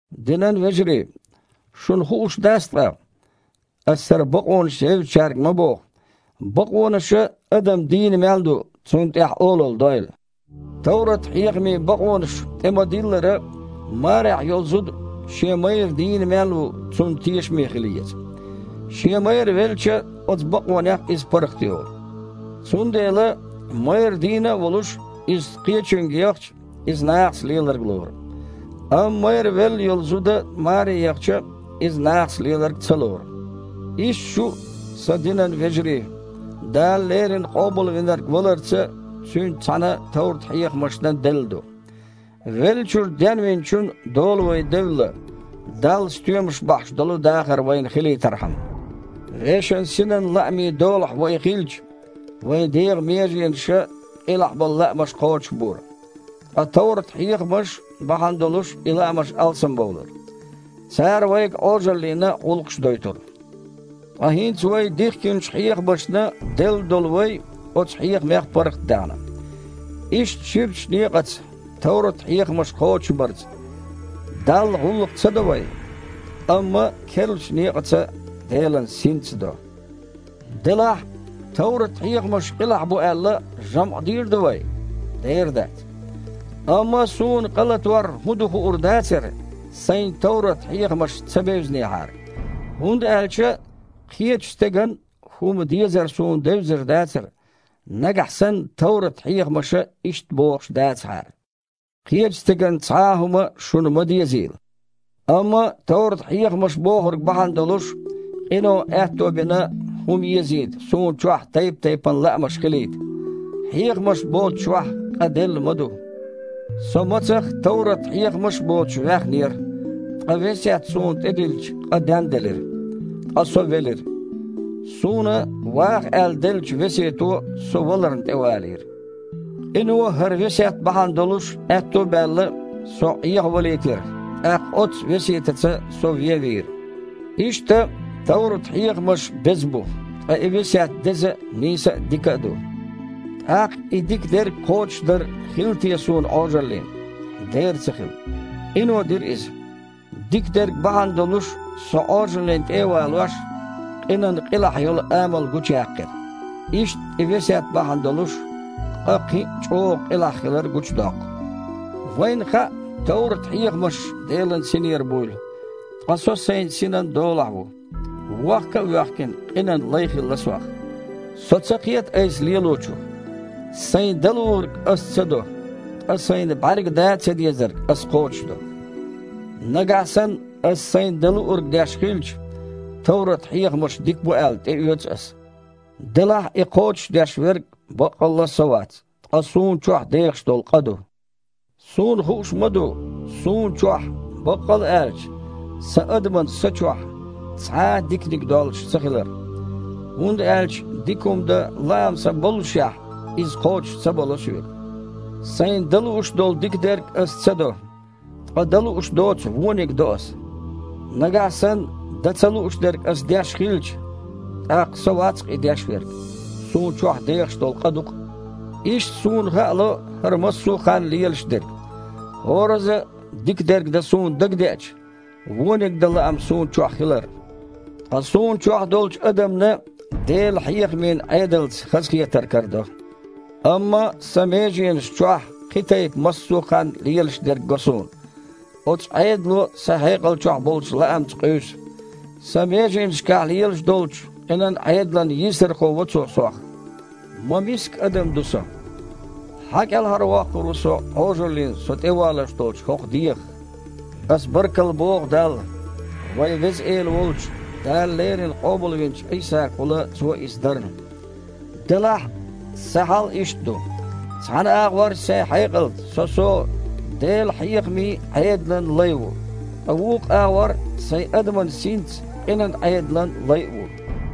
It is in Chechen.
Динан вежарий, шуна хууш дац ткъа (аса хІара бакъонаш евзачаьрга ма боху), бакъонаша, адам дийна мел ду, цунна тІехь олалла дойла? Товрат-хьехамийн бакъонаша тІе-ма-диллара, марехь йолу зуда, шен майра дийна мел ву, цунна тешаме хила еза. Шен майра велча, оцу бакъонех иза паргІатйолу. Цундела, майра дийна а волуш, иза кхечуьнга яхча, иза нахаца леларг лору. Амма майра велла йолу зуда маре яхча, иза нахаца леларг ца лору. Иштта шу а, сан динан вежарий, Дала леррина Къобалвинарг валарца Цуьнца цхьаьна товрат-хьехамашна делла ду. Веллачуьра Денвинчун дола вай девлла, Далла стоьмаш бахьаш долу дахар вайн хилийтархьама. Вешан синан лаамийн долахь вай хилча, вайн дегІан меженаша къилахь болу лаамаш кхочушбора, ткъа товрат-хьехамаш бахьана долуш и лаамаш алсамбовлура. Цара вайга Іожаллина гІуллакхаш дойтура. Ткъа хІинца вай дихкинчу хьехамашна делла долу вай оцу хьехамех паргІатдаьхна. Иштта ширачу некъаца, товрат-хьехамаш кхочушбарца, Далла гІуллакх ца до вай, амма керлачу некъаца, Делан Синца до. Делахь, товрат-хьехамаш къилахь бу аьлла, жамІ дийр ду вай? Дера дац! Амма суна къалатор хІун ду хуур дацара, сайна товрат-хьехамаш ца бевзинехьара. ХІунда аьлча кхечу стеган хІума дезар суна девзар дацара, нагахь санна товрат-хьехамаша иштта бохуш дацахьара: «Кхечу стеган цхьа а хІума шуна ма дезийла». Амма товрат-хьехамаша бохург бахьана долуш, къино аьтто бина хІума езийта суна чохь тайп-тайпана лаамаш хилийта. Хьехамаш боцучохь къа делла ма ду. Со мацах товрат-хьехамаш а боцуш ваьхнера, ткъа весет суна тІедиллича, къа денделира, ткъа со велира. Суна ваха аьлла деллачу весето со валарна тІевалийра. Къино, хІара весет бахьана долуш аьтто а баьлла, со Іехавалийтира, тІаккха оццу весетаца со вен а вийра. Иштта, товрат-хьехамаш беза бу, ткъа и весет деза а, нийса а, дика а ду. ТІаккха и дика дерг кхочушдар хилла те суна Іожаллина? Дера ца хилла! Къино дира иза. Дика дерг бахьана долуш, со Іожаллина тІе а валош, къинан къилахь йолу амал гучуяьккхира. Иштта и весет бахьана долуш, къа кхин а чІогІа къилахь хилар гучудоккху. Вайна хаьа товрат-хьехамаш Делан Синера буйла. Ткъа со сайн синан долахь ву. Вохка а воьхкина, къинан лай хилла сох. Со ца кхета айса лелочух: сайна дан луург аса ца до, ткъа сайна бІаьрга дан а цадезарг ас кхочушдо. Нагахь санна аса сайна дан луург деш хилча, товрат-хьехамаш дика бу аьлла, тІеоьцу аса. Делахь и кхочушдеш верг баккъалла а со вац, ткъа суна чохь дехаш долу къа ду. Суна хууш ма ду, суна чохь, баккъалла аьлча, сан адаман са чохь, цхьа а диканиг доллуш цахилар. ХІунда аьлча дика хІума дан лаам сан боллушехь, иза кхочуш ца бало соьга. Сайна дан лууш долу дика дерг аса ца до, ткъа дан лууш доцу вониг до аса. Нагахь санна дан ца лууш дерг аса деш хилча, тІаккха со вац-кх и деш верг, суна чохь дехаш долу къа ду-кх. Иштта суна хаало хІара массо а ханна лелаш дерг: хІоразза а дика дерг дан суна дагадеача, вониг дан лаам суна чохь хилар. Ткъа суна чохь долчу адамна Делан хьехамийн Іедалца хазахетар карадо. Амма сан меженашна чохь кхин тайпа массо а ханна лелаш дерг го суна. Оцу Іедало сан хьекъал чохь болчу лаамца къуьйсу. Сан меженашкахь лелаш долчу къинан Іедалан йийсархо во цо сох. Ма миска адам ду со! Хьан кІелхьарвоккхур ву со Іожаллина со тІевалош долчу хІокху дегІах? Аса баркалла боху Далла, вайн Веза Эла волчу, Дала леррина къобалвинчу Іийсагахула Цо иза дарна! Делахь, сан хьал иштта ду: цхьана агІор сайн хьекъалца со-со Делан хьехамийн Іедалан лай ву, ткъа вукху агІор сайн адаман синца къинан Іедалан лай а ву.